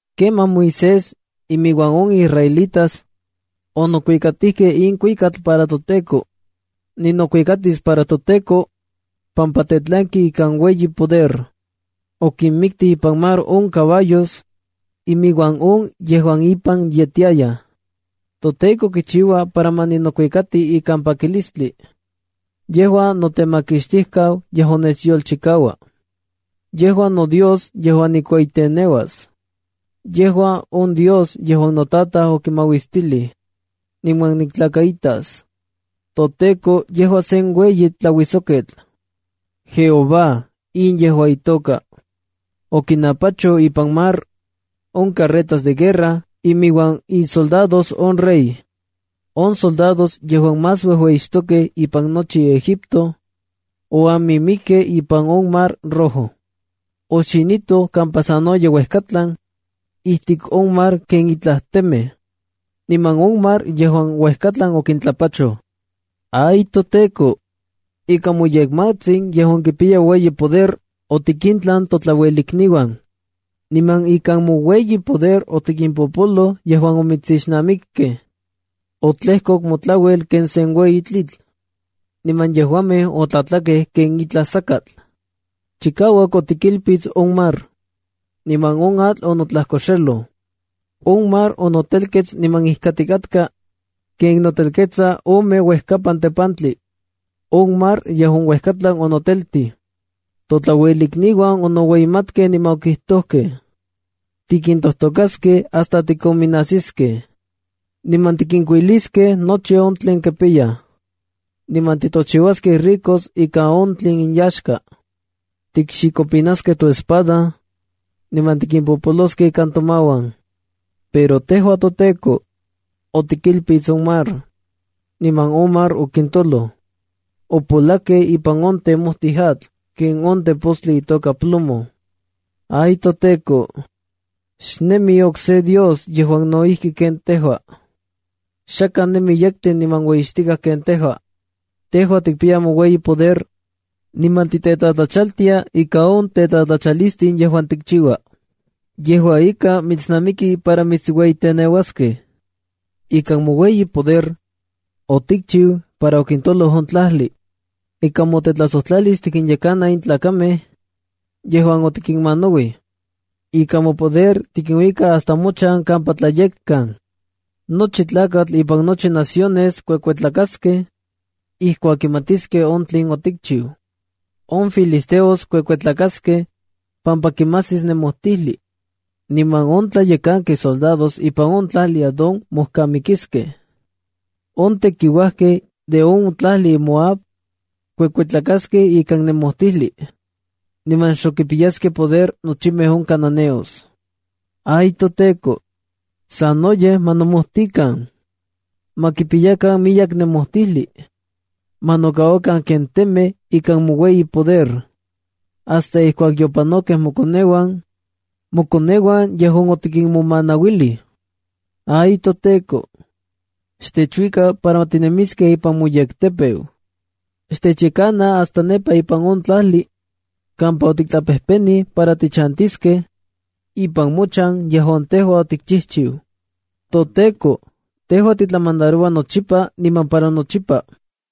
Kemaj Moisés inmiuan on israelitas onokuikatijkej in kuikatl para toTEKO: “Ninokuikatis para toTEKO pampa tetlanki ikan ueyi poder. Okinmiktij ipan mar on caballos inmiuan on yejuan impan yetiayaj. ToTEKO kichiua para ma ninokuikati ikan pakilistli. Yejua notemakixtijkau yejuan nechyolchikaua. Yejua noDios yejuan nikueyiteneuas. Yejua on Dios yejuan notataj okimauistilij, niman niktlakaitas. ToTEKO yejua sen ueyi tlauijsoketl. JEHOVÁ, in yejua itoka. Okinapachoj ipan mar on carretas de guerra, inmiuan isoldados on rey. On soldados yejuan más uejueyixtokej ipan nochi Egipto, oamimikkej ipan on Mar Rojo. Oxinitoj kampa sanoyej uejkatlan ijtik on mar ken itlaj temej. Niman on mar yejuan uejkatlan okintlapachoj. Ay toTEKO, ikan moyekmatsin yejuan kipiya ueyi poder, otikintlan totlauelikniuan. Niman ikan moueyi poder otikimpopoloj yejuan omitsixnamikkej. Otlejkok motlauel ken sen ueyi tlitl, niman yejuamej otlatlakej ken itlaj sakatl. Chikauak otikilpits on mar, niman on atl onotlajkoxeloj. On mar onotelkets niman ijkatikatka ken notelketsa ome uejkapan tepantli. On mar yejuan uejkatlan onoteltij. Totlauelikniuan onoueyimatkej niman okijtojkej: ‘Tikintojtokaskej hasta tikonminajsiskej, niman tikinkuiliskej nochi on tlen kipiyaj, niman titochiuaskej ricos ikan on tlen inyaxka. Tikxikopinaskej toespada niman tikimpopoloskej ikan tomauan.’ Pero tejua, toTEKO, otikilpits on mar, niman on mar okintoloj. Opolakkej ipan on temotij atl ken on tepostli itoka plomo. ¡Ay toTEKO! Xnemi okse dios yejuan no ijki ken tejua. Xakaj nemi yektli niman ueyixtikaj ken tejua. Tejua tikpiya moueyi poder, niman titetlatlachaltia ika on tetlatlachalistin yejuan tikchiua. Yejua ika, mitsnamiki para mitsueyiteneuaskej. ¡Ikan moueyi poder, otikchiu para okintoloj on tlajli! Ika motetlajsojtlalis tikinyekana in tlakamej yejuan otikinmanauij. Ika mopoder tikinuika hasta mochan kampa tlayekkan. Nochi tlakatl ipan nochi naciones kuekuetlakaskej ijkuak kimatiskej on tlen otikchiu. On filisteos kuekuetlakaskej pampa kimajsis nemojtijli. Niman on tlayekankej soldados ipan on tlajli Edom mojkamikiskej. On tekiuajkej de on tlajli Moab kuekuetlakaskej ikan nemojtijli. Niman xok kipiyaskej poder nochimej on cananeos. ¡Ay toTEKO! ¡Sanoyej ma nomojtikan! ¡Ma kipiyakan miyek nemojtijli! ¡Ma nokauakan ken temej ikan moueyi poder, hasta ijkuak yopanojkej mokoneuan, mokoneuan yejuan otikinmomanauilij! ¡Ay toTEKO! Xtechuika para tinemiskej ipan moyektepeu. Xtechyekana hasta nepa ipan on tlajli kampa otiktlapejpenij para tichantiskej, ipan mochan yejuan tejua otikchijchiu. ToTEKO, tejua titlamandaroua nochipa niman para nochipa.”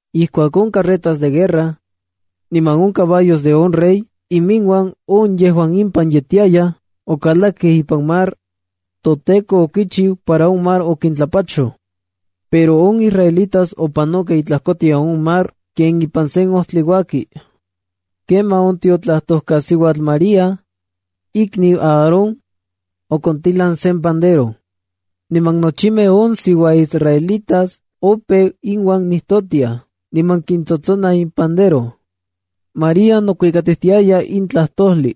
Ijkuak on carretas de guerra niman on caballos de on rey inmiuan on yejuan impan yetiayaj okalakej ipan mar, toTEKO okichiu para on mar okintlapachoj. Pero on israelitas opanokej itlajkotian on mar ken ipan sen ojtli uaki. Kemaj on tiotlajtojkasiuatl María, ikniu Aarón, okontilan sen pandero. Niman nochimej on siuaisraelitas opeu iuan nijtotiaj niman kitsotsonaj impandero. María nokuikatiaya in tlajtojli: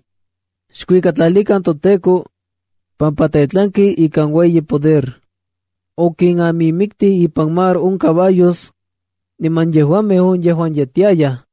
“Xkuikatlalikan toTEKO, pampa Tetlanki ikan ueyi poder. Okinamimiktij ipan mar on caballos, niman yejuamej on yejuan yetiayaj.”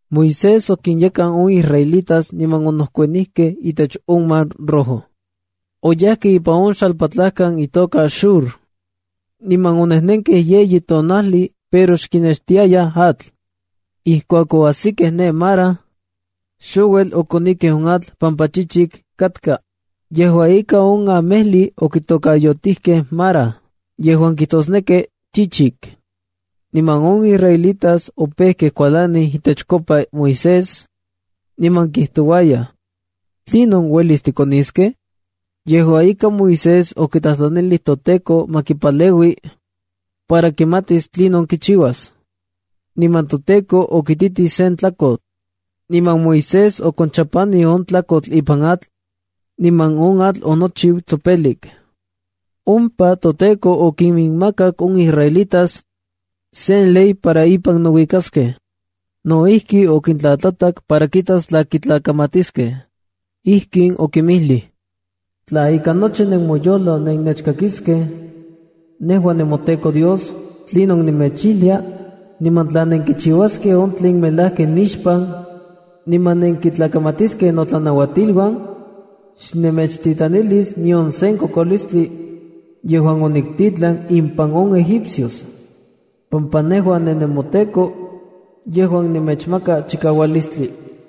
Moisés okinyekan on israelitas niman onejkuanijkej itech on Mar Rojo. Oyajkej ipan on xalpatlajkan itoka Shur. Niman onejnenkej yeyi tonajli pero xkinextiayaj atl. Ijkuak oajsikej ne Mara, xouel okonikej on atl pampa chichik katka. Yejua ika, on amejli okitokayotijkej Mara yejuan kijtosneki “chichik”. Niman on israelitas opejkej kualanij itechkopa Moisés, niman kijtouayaj: “¿Tlinon uelis tikoniskej?” Yejua ika, Moisés okitlajtlanij toTEKO ma kipaleui para kimatis tlinon kichiuas, niman toTEKO okititij sen tlakotl. Niman Moisés okonchapanij on tlakotl ipan atl, niman on atl onochiu tsopelik. Ompa toTEKO okiminmakak on israelitas sen ley para ipan nouikaskej. No ijki, okintlatlatak para kitas tla kitlakamatiskej. Ijkin okinmijlij: “Tla ika nochi nemoyojlo nennechkakiskej nejua nemoTEKO Dios tlinon nemechijlia, niman tla nenkichiuaskej on tlen melajki nixpan niman nenkitlakamatiskej notlanauatiluan, xnemechtitlanilis nion sen kokolistli yejuan oniktitlan impan on egipcios, pampa nejua ninemoTEKO yejuan nemechmaka chikaualistli.”